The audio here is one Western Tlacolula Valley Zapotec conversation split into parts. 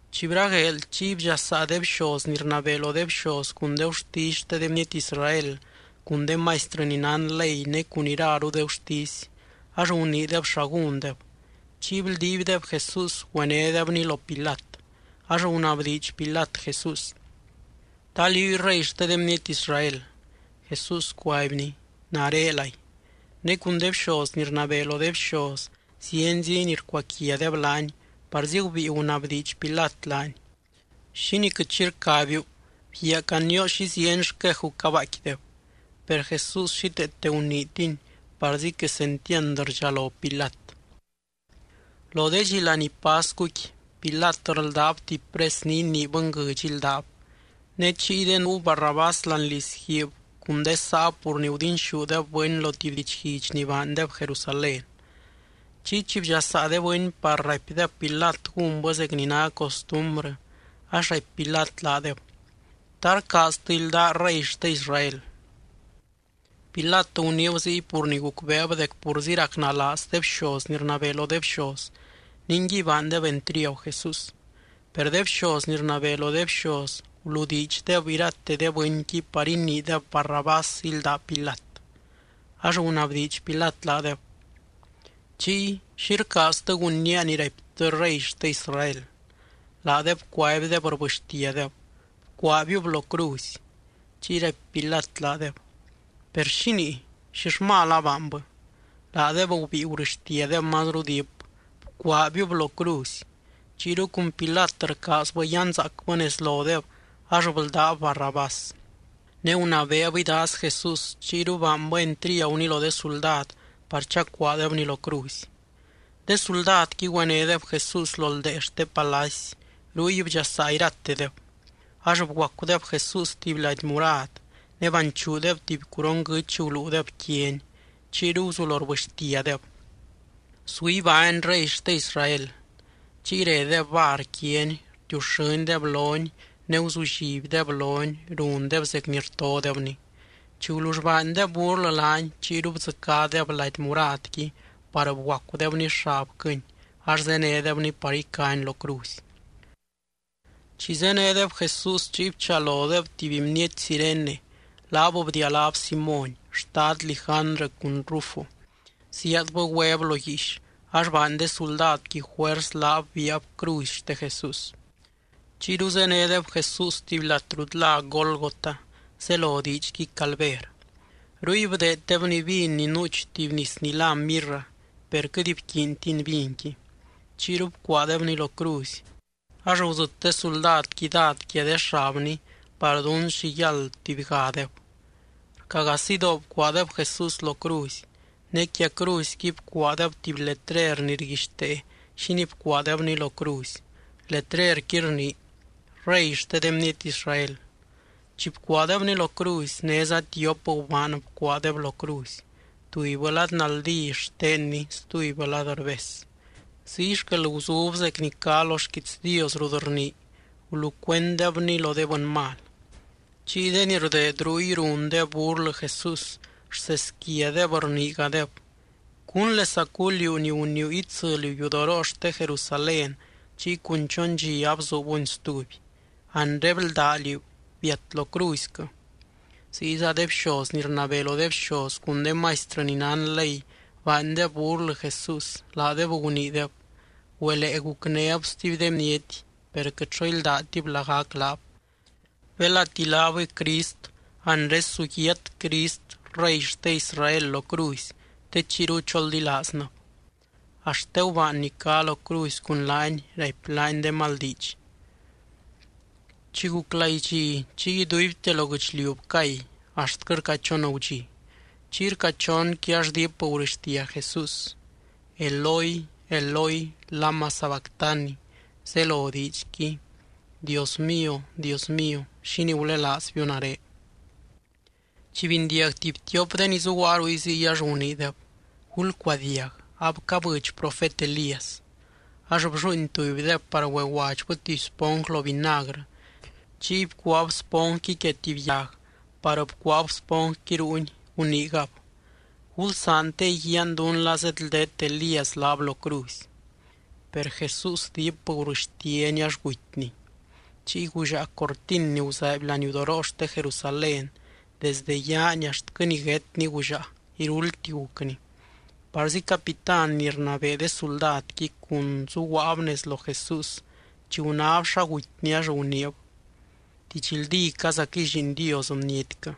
Chi bragueel, chiy bdxasaa de bxoz ni rnabee lo de bxoz cun de gurtisy xte de bniety Israel cun de maistrɨ ni nán ley ne cun iraru de gurtisy, ax guniideb xa gúndeb. Chiy bldiibdeb Jesús güenédebny lo Pilat. Ax gunabdiidx Pilat Jesús: —¿Ta liúy Rey xte de bniety Israel? Jesús cuaibny: —Narelay. Ne cun de bxoz ni rnabee lo de bxoz zienzi ni rcuaquiadeb laany, parzi gubíi gunabdiidx Pilat laany: —¿Xínii quɨt xi rcabiu? Bguiaa canioo xi zieny xqueju cabaaicquideb. Per Jesús xíteete guniitiny, parzi quesentiand rdxalo Pilat. Lo de dxi laní pascuqui, Pilat rldáb tuby pres ni inii bɨnguɨdx íldab. Ne chiyde nuu Barrabás láani lizguiib cun de saab pur ni gudinxúdeb bɨny lo tuby didxguidx ni baandeb Jerusalén. Chiy chi bdxasaa de bɨny par raipdeb Pilat gúnbɨ zec ni ná costumbrɨ, ax raipy Pilat laadeb: —¿Ta rcaaztɨ ildaa Rey xte Israel? Pilat guniib ziy pur ni gucbeeb dec purzi racnalaaz de bxoz ni rnabee lo de bxoz, ningui baandeb entriagu Jesús. Per de bxoz ni rnabee lo de bxoz guludiidxdeb irate de bɨnqui par iniideb Barrabás ílda Pilat. Ax gunabdiidx Pilat laadeb: —Chiy, ¿xi rcaaztɨ gunnía ni raiptɨ Rey xte Israel? Laadeb cuaibdeb rbɨxtiadeb: —¡Bcuaabiub lo cruzy! Chiy raipy Pilat laadeb: —Per, ¿xínii? ¿Xill mal abaanbɨ? Laadeb gubíi gurɨxtiadeb mazru diip: —¡Bcuaabiub lo cruzy! Chiyru cun Pilat rcaazbɨ yanzaacbɨ nez lodeb, ax bldáb Barrabás. Ne gunabeeb idaaz Jesús, chiyru baanbɨ entriaguny lo de suldad par chacuaadebny lo cruzy. De suldadqui güenédeb Jesús lo ldee xte palacy, ruy bdxasaa iratedeb. Ax bguacudeb Jesús tuby lady murad, ne banchuudeb tuby curon guɨ́ch guluudeb quiany. Chiyru guzulo rbɨxtiadeb: —¡Su ibány Rey xte Israel! Chiy redeb var quiany, rtiuxɨ́ndeb lony ne guzullibdeb lony, rundeb zec ni rtodebny. Chi gulull baandeb burlɨ laany, chiyru bdzɨcádeb lady muradqui par bguacudebny xabquɨny ax zénedebny par icany lo cruzy. Chi zénedeb Jesús chiy bchalodeb tuby bniety Cirene, laab bdialáb Simóny, xtad Lijandrɨ cun Rufo, zíaadbɨ güeb lo guiix ax baany de suldadqui juers laab biaab cruzy xte Jesús. Chiyru zénedeb Jesús tuby lat rut lá Gólgota, zelo diidxqui Calver. Ruy bdeeddebny vin ni nuuch tuby nis ni lá mirra, per quɨt bquiintiny vinqui. Chiyru bcuaadebny lo cruzy. Ax gudzɨt de suldadqui dád quia de xabny par dún xi yáld tubygadeb. Rca gaa sidoo bcuaadeb Jesús lo cruzy. Ne quia cruzyqui bcuaadeb tuby letrer ni rguixtee xínii bcuaadebny lo cruzy. Letrerqui rnii: REY XTE DE BNIETY ISRAEL. Chi bcuaadebny lo cruzy, néza tiop gubaan bcuaadeb lo cruzy, tubybɨ lad naldí xtenny stubybɨ lad rbes. Ziy xquel guzub zec ni cá lo xquiits Dios rut rnii: “Gulucuenddebny lo de bɨny mal.” Chiy de ni rdeed ruy rundeb burlɨ Jesús. Rseesquiadeb rniigadeb: —Cúnlesacuu, liú ni guniiu itsɨliu yudoroo xte Jerusalén chiy cun chon dxi abzuubuni stuby, anre bldá liú, biat lo cruzyquɨ. Ziyza de bxoz ni rnabee lo de bxoz cun de maistrɨ ni nán ley baandeb burlɨ Jesús, laadeb guniideb: —Güelee gucnéb stuby de bniety, per quɨt xo íldatib lagac laab. Belati laabɨy Crist, anre su yiat Crist Rey xte Israel lo cruzy, te chiyru choldilaaznɨb. Axt de gubaan ni cá lo cruzy cun laany raipy laany de mal diidx. Chi guc laidxi, chiy iduibte lo guɨchliu bcay, axtquɨ rca chon gudxi. Chiy rca chonqui ax diip gurɨxtia Jesús: —Eloi, Eloi, ¿lama sabactani? —zelo diidxqui: Dios mío, Dios mío, ¿xínii gulelaazbiu nare? Chi bindiag tuby tiop de ni zuguaa ruy ziy, ax guniideb: —Gulcuadiag. Abcabɨdx profet Elías. Ax blluuin tubydeb par güeguadxbɨ tuby sponj lo vinagrɨ. Chiy bcuaab sponjqui quia tuby yag par bcuaab sponjqui ruuny, guniigab: —Gulsaan te iguiaan dún la zeedldet Elías laab lo cruzy. Per Jesús diip gurɨxtiany ax gutyny. Chiy gullaa cortin ni guzaaiby laniudoroo xte Jerusalén, desdɨ yaani axtquɨ niguétni gullaa, iruldti gucni. Parzi capitán ni rnabee de suldadqui cun zuguaab nez lo Jesús, chi gunáb xa gutyny ax guniib: —Didxldícazaquɨy Lliin Dios bnietquɨ.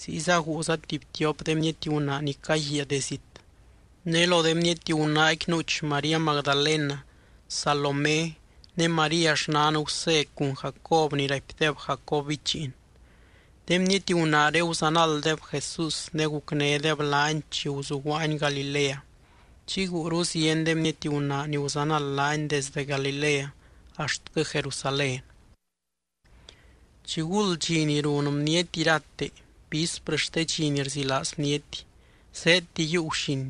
Ziyza guuza tuby tiop de bniety gunaa ni caguiaa de zit. Ne lo de gunaaqui nuuch María Magdalena, Salomé ne María xnan Gusé cun Jacob ni raipdeb Jacob bichiin. De bniety gunaaré guzanalddeb Jesús ne gucnédeb laany chi guzuguaany Galilea. Chiy guuru zieny de bniety gunaa ni guzanald laany desde Galilea axtquɨ Jerusalén. Chiguld dxi ni run bniety irate, vísprɨ xte dxi ni rzilaaz bniety, zéedti yiiu guxin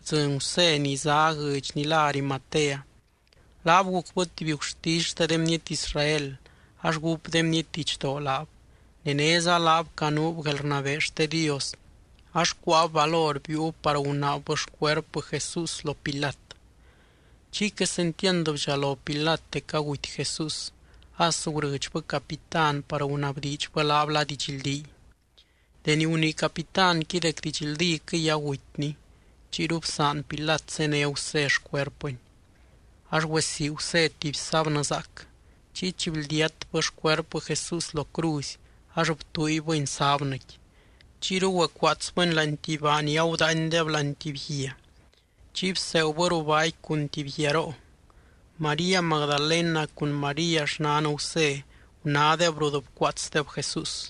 bdzɨny Gusé ni zá guɨdx ni lá Arimatea. Laab gucbɨ tuby gurtisy xte de bniety Israel ax gúp de bniety didxdoo laab. Ne néza laab canuub guelrnabee xte Dios, ax cuáab valor biiub par gunaabbɨ xcuerpɨ Jesús lo Pilat. Chiy quesentiand bdxalo Pilat dec aguty Jesús, as gurɨdxbɨ capitán par gunabdiidxbɨ laab la didxldíy. Deni gunii capitánqui dec didxldíquɨy agutyny, chiyru bsaan Pilat zéne Gusé xcuerpɨny. Ax güesii Gusé tuby sábnɨ zaac. Chiy chi bldiatbɨ xcuerpɨ Jesús lo cruzy ax btuuibɨny sábnɨqui. Chiyru güecuaatsbɨny láani tuby baa ni agudaaindeb láani tuby guia. Chiy bseegubɨ ruu baaqui cun tuby guiaroo. María Magdalena cun María xnan Gusé gunádeb rut bcuaatsdeb Jesús.